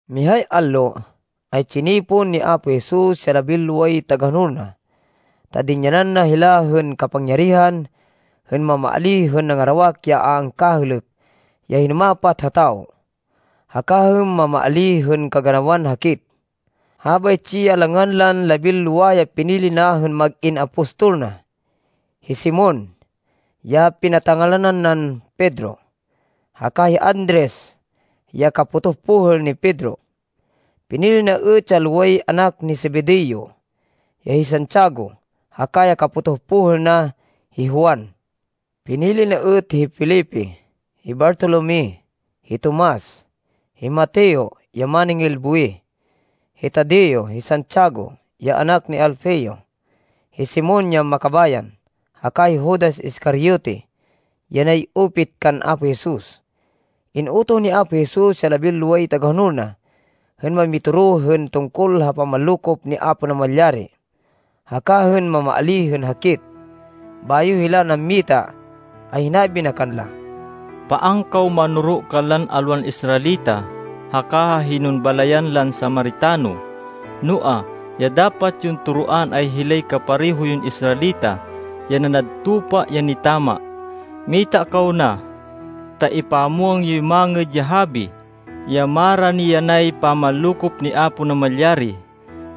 Mihay allo, ay tsinipon ni Apo Jesus ya labinloway tagahonol na, ta dinyanan na hila hên kapangyarihan hên mamaalíh hên nangarawak ya a angkahêlêk ya hinumapat ha tawo, haka hên mamaalíh hên kaganawan hakit. Habaytsi ya langan lan labinlowa ya pinili na hên mag-in apostol na: Hi Simon, ya pinata-ngalanan nan Pedro, haka hi Andres ya kapotoh pohêl ni Pedro. Pinili na êt ya loway anak ni Zebedeo ya hi Santiago, haka ya kapotoh pohêl na, hi Juan. Pinili na êt hi Felipe, hi Bartolome, hi Tomas, hi Mateo ya máningil buwih, hi Tadeo, hi Santiago ya anak ni Alfeo, hi Simon ya Makabayan, haka hi Judas Iscariote ya nay-upit kan Apo Jesus. In-utoh ni Apo Jesus ya labinloway tagahonol na hên mamitoro hên tungkol ha pamanlokop ni Apo Namalyari, haka hên mamaalíh hên hakit. Bayo hila nammita, ay hinabi na kanla, “Paan kaw manoro kanlan alwan Israelita, haka ha hinon balayan lan Samaritano. Noa, ya dapat yon toroan ay hilay kapareho yon Israelita, ya nanad tupa ya nitama. Mita kaw na ta ipamwang yo ya Mangêd ya Habi, ya marani yanay pamanlokop ni Apo Namalyari.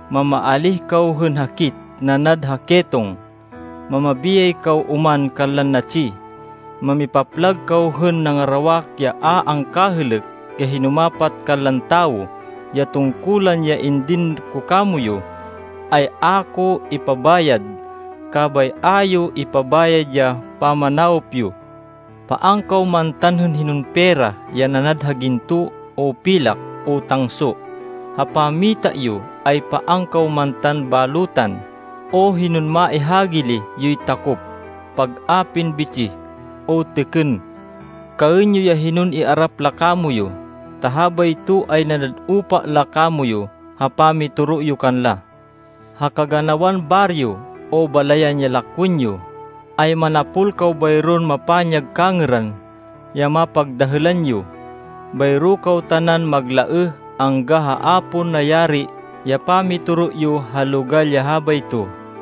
Mamaalíh kaw hên hakit, nanad ha ketong. Mamabiyay kaw oman kanlan natsi. Mamipaplag kaw hên nangarawak ya a angkahêlêk ya hinumapat kanlan tawo. Ya tungkulan ya indin ko kamoyu, ay a ko impabayad, kabay a yo ipabayad ya pamanawop yo. Paan kaw mantan hên hinon pera ya nanad ha ginto, o pilak, o tangso. Ha pammita yo ay paan kaw mantan balutan o hinon maihagili yoy takop, pag-apin bitsih, o têkên. Kaên yo ya hinon iarap la kamoyu, ta habayto ay nanad upa la kamoyu ha pamitoro yo kanla. “Ha kaganawan baryo, o balayan ya lakwên yo, ay manapol kaw bayron mapanyag kangêran ya mapagdahêlan yo. Bayro kaw tanan maglaêh angga ha a pon nayari ya pamitoro yo ha logal ya habayto.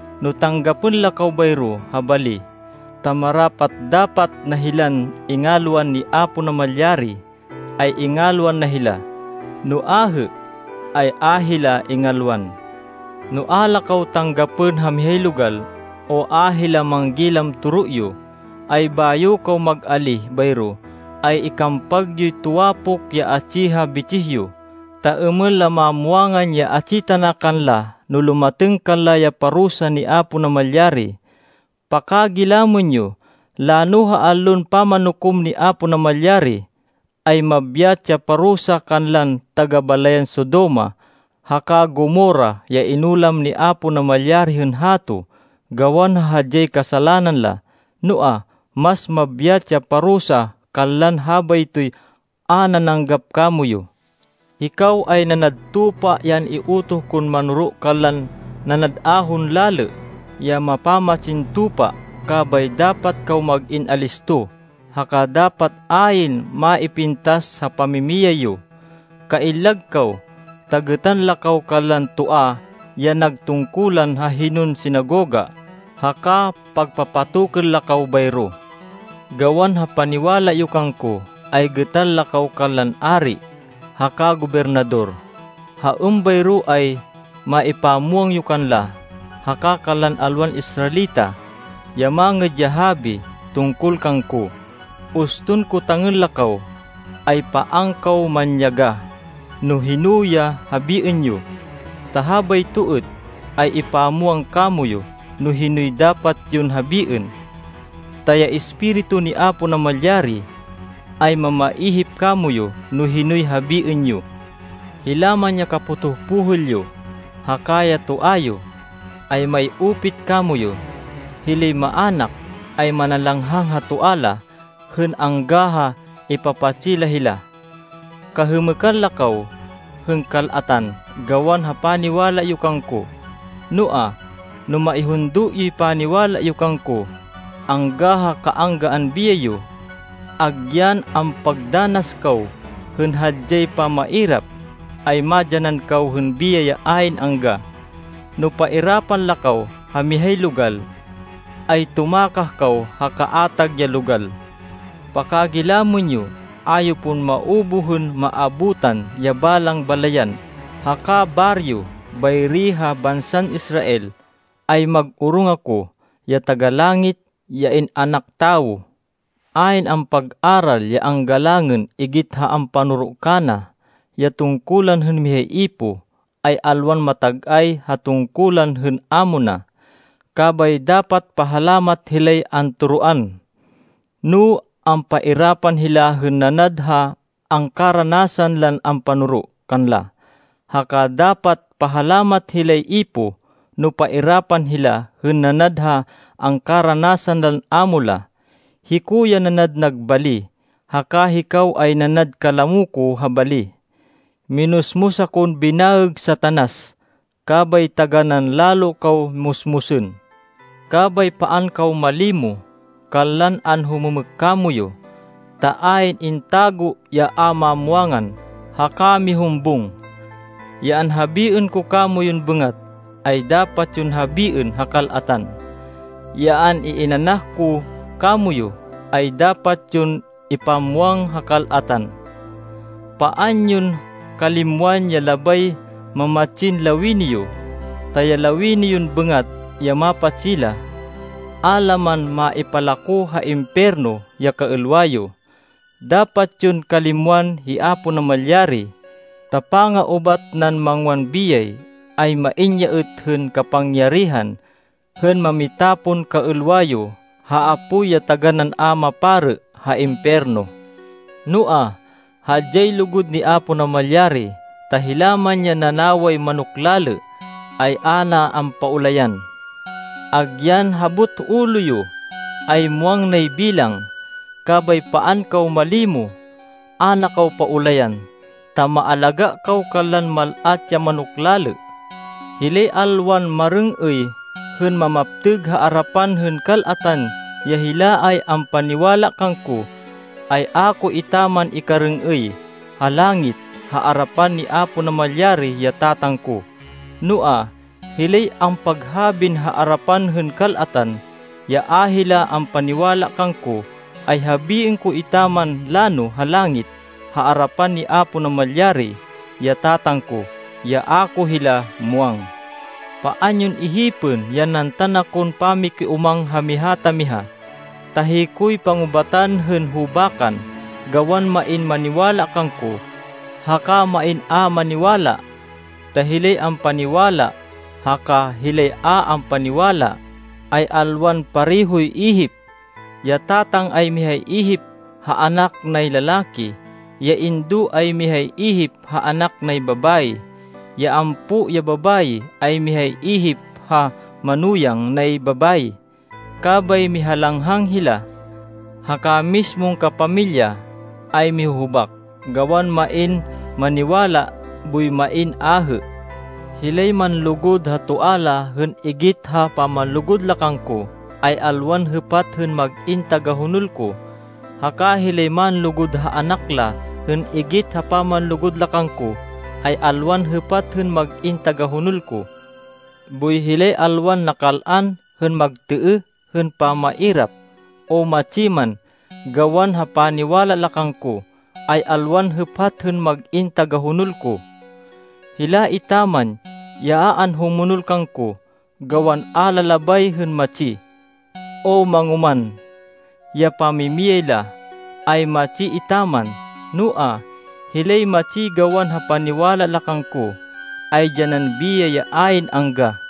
No tanggapên la kaw bayro ha bali, ta marapat-dapat na hilan ingalwan ni Apo Namalyari, ay ingalwan na hila, no ahê, ay a hila ingalwan. No a la kaw tanggapên ha mihay logal, o a hila manggilam toro yo, ay bayo kaw mag-alíh bayro, ay ikampag yoy tuwapok ya atsi ha bitsih yo, ta êmên la mamwangan ya atsi tana kanla no lumatêng kanla ya parusa ni Apo Namalyari. Pakagilamên yo, lano ha Allon Pamanukom ni Apo Namalyari, ay mabyat ya pamarusa kanlan taga-balayan Sodoma, haka Gomorra ya inulam ni Apo Namalyari hên hato, gawan ha hadyay kasalanan la. Noa, mas mabyat ya pamarusa kanlan habaytoy a nananggap kamoyu.” “Hikaw ay nanad tupa ya an-iutoh kon manoro kanlan nanad ahon lalê, ya mapamatsin tupa. Kabay dapat kaw mag-in alisto, haka dapat ayn maipintas ha pamimiyay yo. Kaillag kaw, ta gêtan la kaw kanlan toa ya nag tungkulan ha hinon sinagoga haka pagpapatokên la kaw bayro. Gawan ha paniwala yo kangko, ay gêtan la kaw kanlan ari haka gobernador, ha êmbayro ay maipamwang yo kanla, haka kanlan alwan Israelita, ya Mangêd ya Habi tungkol kangko. Uston kotangên la kaw, ay paan kaw manyagah no hino ya habiên yo, ta habayto êt, ay ipamwang kamoyu no hinoy dapat yon habiên, ta ya Espiritu ni Apo Namalyari, ay mamaihip kamoyu no hinoy habiên yo. “Hila man ya kapotoh pohêl yo, haka ya toa yo, ay may-upit kamoyu. Hilay maának ay manalanghang ha toa la hên angga ha ipapatsi la hila. Kahêmêkan la kaw hên kal-atan, gawan ha paniwala yo kangko. Noa, no maihundo yoy paniwala yo kangko, angga ha anggaan biyay yo, agyan ampagdanas kaw hên hadyay pamairap, ay madyanan kaw hên biyay ya ayn angga. No pairapan la kaw ha mihay logal, ay tumakah kaw ha kaatag ya logal. Pakagilamên yo, a yo pon maubuh hên maabutan ya balang balayan haka baryo bayri ha bansan Israel, ay mag-orong ako, ya Taga-Langit, ya In-anak Tawo. “Ayn ampag-aral ya anggalangên igit ha ampanoro kana. Ya tungkulan hên mihay ipoh, ay alwan matag-ay ha tungkulan hên amo na. Kabay dapat pahalamat hilay antoroan, no ampairapan hila hên nanad ha angkaranasan lan ampanoro kanla, haka dapat pahalamat hilay ipoh, no pairapan hila hên nanad ha angkaranasan lan amo la. Hiko ya nanad nag bali, haka hikaw ay nanad kalamo ko ha bali. Minusmus akon binaêg Satanas, kabay taganán lalo kaw musmusên.” “Kabay paan kaw malimo kanlan anhumêmêk kamoyu, ta ayn intago ya a mamwangan haka mihumbung. Ya anhabiên ko kamoyun bêngat, ay dapat yon habiên ha kal-atan. Ya an-iinanah ko kamoyu, ay dapat yon ipamwang ha kal-atan. Paan yon kalimwan ya labay mamatsin lawini yo, ta lawini yon bêngat ya mapatsi la. A la man maipalako ha impiyerno ya kaêlwa yo. Dapat yon kalimwan hi Apo Namalyari, ta panga-ubat nan mangwan biyay, ay main ya êt hên kapangyarihan hên mamitapon kaêlwa yo ha apoy ya taganán a maparê ha impiyerno. Noa, hadyay lugud ni Apo Namalyari, ta hila man ya nanaway manok lalê, ay a na ampaulayan. Agyan habot ulo yo, ay muwang nay bilang. Kabay paan kaw malimo. A na kaw paulayan, ta maalagá kaw kanlan mal-at ya manok lalê.” “Hilay alwan marêng-êy hên mamaptêg ha arapan hên kal-atan ya hila ay ampaniwala kangko, ay a ko etaman ikarêng-êy ha langit, ha arapan ni Apo Namalyari, ya Tatang ko. Noa, hilay ampaghabin ha arapan hên kal-atan, ya a hila ampaniwala kangko, ay habiên ko etaman lano ha langit, ha arapan ni Apo Namalyari, ya Tatang ko, ya a ko hila muwang.” “Paan yon ihipên ya nantan akon pamakiúmang ha miha ta miha, ta hikoy pangubatan hên hubakan, gawan main maniwala kangko, haka main a maniwala. Ta hilay ampaniwala haka hilay a ampaniwala, ay alwan parehoy ihip. Ya tatang ay mihay ihip ha anak nay lalaki. Ya indo ay mihay ihip ha anak nay babayi. Ya ampo ya babayi, ay mihay ihip ha manuyang nay babayi, kabay mihalang-hangan hila. Haka mismon kapamilya ay mihuhubak, gawan main maniwala boy main ahê. “Hilay manlugud ha toa la hên igit ha pamanlugud la kangko, ay alwan hêpat hên mag-in tagahonol ko. Haka hilay manlugud ha anak la hên igit ha pamanlugud la kangko, ay alwan hêpat hên mag-in tagahonol ko. Boy hilay alwan nakal-an hên magtêêh hên pamairap, o matsi man, gawan ha paniwala la kangko, ay alwan hêpat hên mag-in tagahonol ko. Hila etaman ya a anhumonol kangko, gawan a la labay hên matsi, o mangoman ya pamimiyay la, ay matsi etaman. Noa, hilay matsi gawan ha paniwala la kangko, ay dyanan biyay ya ayn angga.”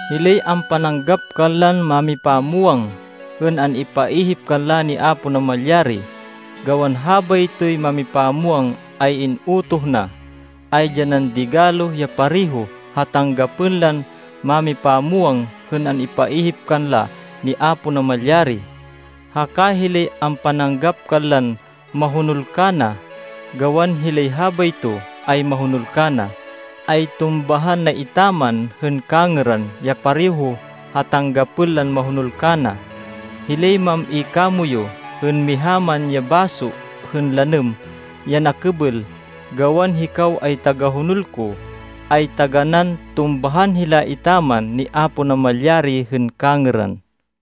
Hilay ampananggap kanlan mámipamwang hên an-ipaihip kanla ni Apo Namalyari, gawan habaytoy mámipamwang ay in-utoh na, ay dyanan digalo ya pareho ha tanggapên lan mámipamwang hên an-ipaihip kanla ni Apo Namalyari. Haka hilay ampananggap kanlan mahonol kana, gawan hilay habayto ay mahonol kana, ay tumbahan na etaman hên kangêran ya pareho ha tanggapên lan mahonol kana. Hilay mam-i kamoyu hên miha man ya baso hên lanêm ya nakêbêl, gawan hikaw ay tagahonol ko, ay taganán tumbahan hila etaman ni Apo Namalyari hên kangêran.”